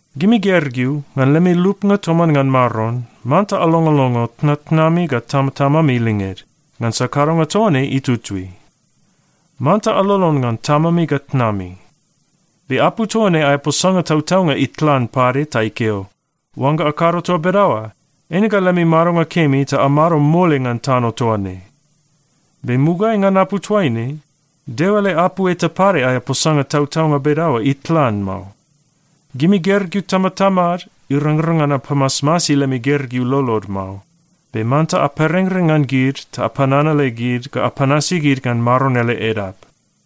Gimi gergeu, ngan lemi lupnga toman ngan Maron, manta alongolongo tnatnami ga tamatamami linged, ngansa kadonga toa ne itutui. “Manta alolon ngan tamami ga tnami.” Be apu toa ne aea posanga tautaunga itlan pade ta ikeo, “Oangga akado toa bedaoa, eine ga lemi madonga kemi ta amado mole ngan tano toa ne.” Be mugaeai ngan apu toaine, Deo ele apu eta pade aea posanga tautaunga bedaoa itlan mao. Gimi gergeu tamatamad, irangrang ngan apamasmasi lemi gergeu lolod mao. Be manta aperengreng ngan gid ta apananale gid ga apanasi gid ngan Maron ele edap.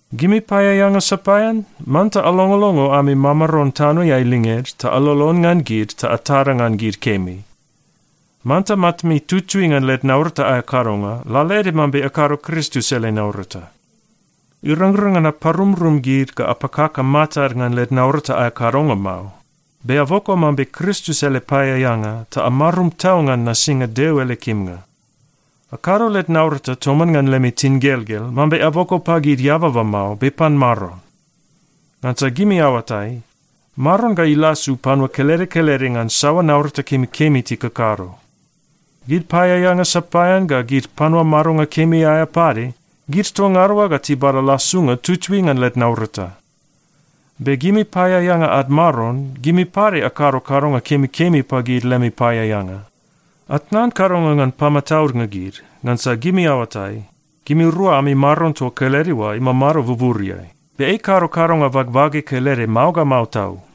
Gimi paeaeanga sapaean, manta alongolongo ami mamaron tanoeai linged ta alolon ngan gid ga atada ngan gid kemi. Manta matami tutui ngan led naurata aea kadonga lalaede mambe akado Kristus ele naurata. Irangrang ngan aparumrum gid ga apakaka matad ngan led naurata aea kadonga mao. Be aboko mambe Kristus ele paeaeanga ta amarum tau ngan nasinga Deo ele kimnga. Akado led naurata toman ngan lemi tingelgel, mambe aboko pagid eababa mao, be pan Maron. Ngansa gimi aoatai, Maron ga ilasu panua kelede kelede ngan saoa naurata kemikemi tikakado. Gid paeaeanga sapaean ga gid panua madonga kemi aea pade, gid toa ngada oa ga tibada lasunga tutui ngan led naurata. Be gimi paeaeanga ad maron, gimi pade akado kadonga kemikemi pagid lemi paeaeanga. Atnan kadonga ngan pamataudnga gid, ngansa gimi aoatai, gimirua ami Maron toa kelede oa imamado buburiai. Be ei ikado kadonga bagbage kelede mao ga mao tau.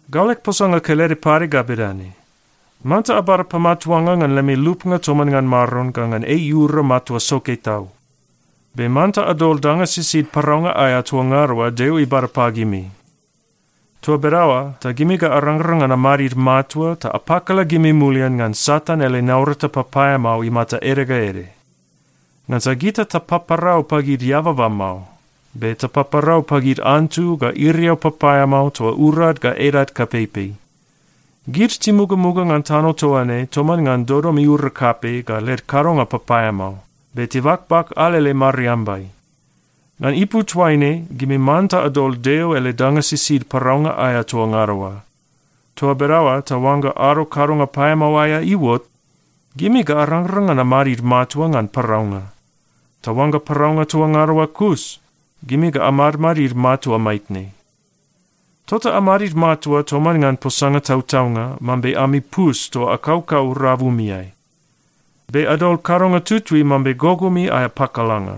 Gau leg posanga kelede pade ga bedane: Manta abada pamatuanga ngan lemi lupnga toman ngan Maron ga ngan ei iura matua soke tau. Be manta adol danga sisid paraunga aea toa ngada oa Deo ibada pagimi. Toa bedaoa ta gimi ga arangrang ngan amadid matua ta apakala gimi mulian ngan Satan ele naurata papaeamao imata ede ga ede. Ngansa gita tapaparau pagid eababa mao, be tapaparau pagid antu ga iriau papaeamao toa urad ga edad kapeipei. Gid timugamuga ngan tano toa ne toman ngan dodom iura kapei ga led kadonga papaeamao, be tibakbak alele mariambai. Ngan ipu toaine, gimi manta adol Deo ele danga sisid paraunga aea toa ngada oa. Toa bedaoa ta oangga ado kadonga paeamao aea iuot, gimi ga arangrang ngan amadid matua ngan paraunga. Ta oangga paraunga toa ngada oa kus, gimi ga amadmadid matua maitne. Tota amadid matua toman ngan posanga tautaunga mambe ami pus toa akaukau rabumiai. Be adol kadonga tutui mambe gogomi aea pakalanga.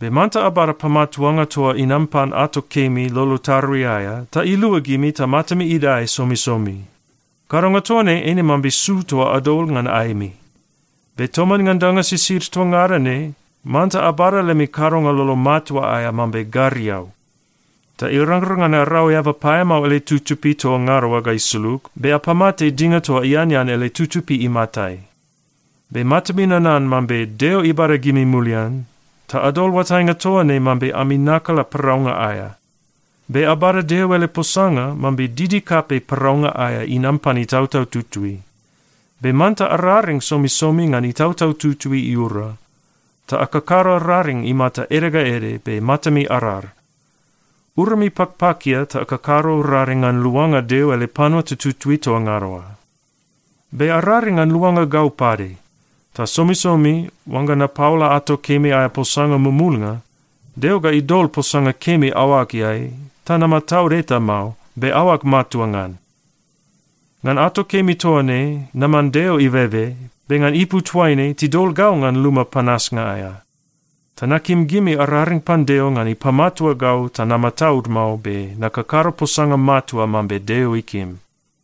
Be manta abada pamatuanga toa inam pan ato kemi lolo tarui aea ta ilua gimi ta matami idae somisomi. Kadonga toa ne eine mambe su toa adol ngan aemi. Be toman ngan danga sisid toa ngada ne, manta abada lemi kadonga lolo matua aea mambe gariau. Ta irangrang ngan arau eaba paeamao ele tutupi toa ngada oa ga isulug, be apamate dinga toa ianean ele tutupi imatai. Be matami nanan mambe Deo ibada gimi mulian, ta adol oatainga toa ne mambe ami nakala paraunga aea. Be abada Deo ele posanga mambe didi kapei paraunga aea inam pan Itautau Tutui. Be manta araring somisomi ngan Itautau Tutui iura. Ta akakado raring imata ede ga ede be matami arar. Urami pakpakia ta akakado raring ngan luanga Deo ele panua tututui toa ngada oa. Be araring ngan luanga gau pade. Ta somisomi oangga napaola ato kemi aea posanga mumulnga, Deo ga idol posanga kemi aoageai ta namataud eta mao, be aoag matua ngan. Ngan ato kemi toa ne, naman Deo ibebe, be ngan ipu toaine, tidol gau ngan luma panasnga aea. Ta nakim gimi araring pan Deo ngan ipamatua gau ta namataud mao be nakakado posanga matua mambe Deo ikim.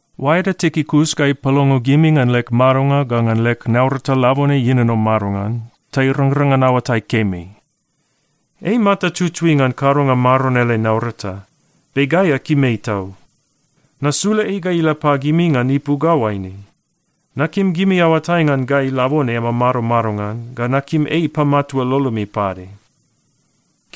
Oaeda Tikikus ga ipalongo gimi ngan leg madonga ga ngan leg naurata labone ienono madongan ta irangrang ngan aoatai kemi. Ei imata tutui ngan kadonga Maron ele naurata, be gai akim ei tau. Nasula ei ga ila pagimi ngan ipu ga oaine: Nakim gimi aoatai ngan gai labone amamado madongan ga nakim ei ipamatua lolomi pade.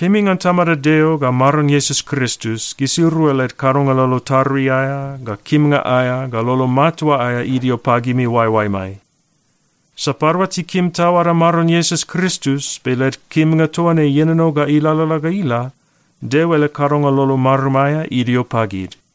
Kemi ngan Tamada Deo ga Maron Iesus Kristus, gisirua led kadonga lolo tarui aea ga kimnga aea ga lolo matua aea idio pagimi oaeoaemai. Sapadua tikim tau ada Maron Iesus Kristus, be led kimnga toa ne ienono ga ilalala ga ila, Deo ele kadonga lolo marum aea idio pagid.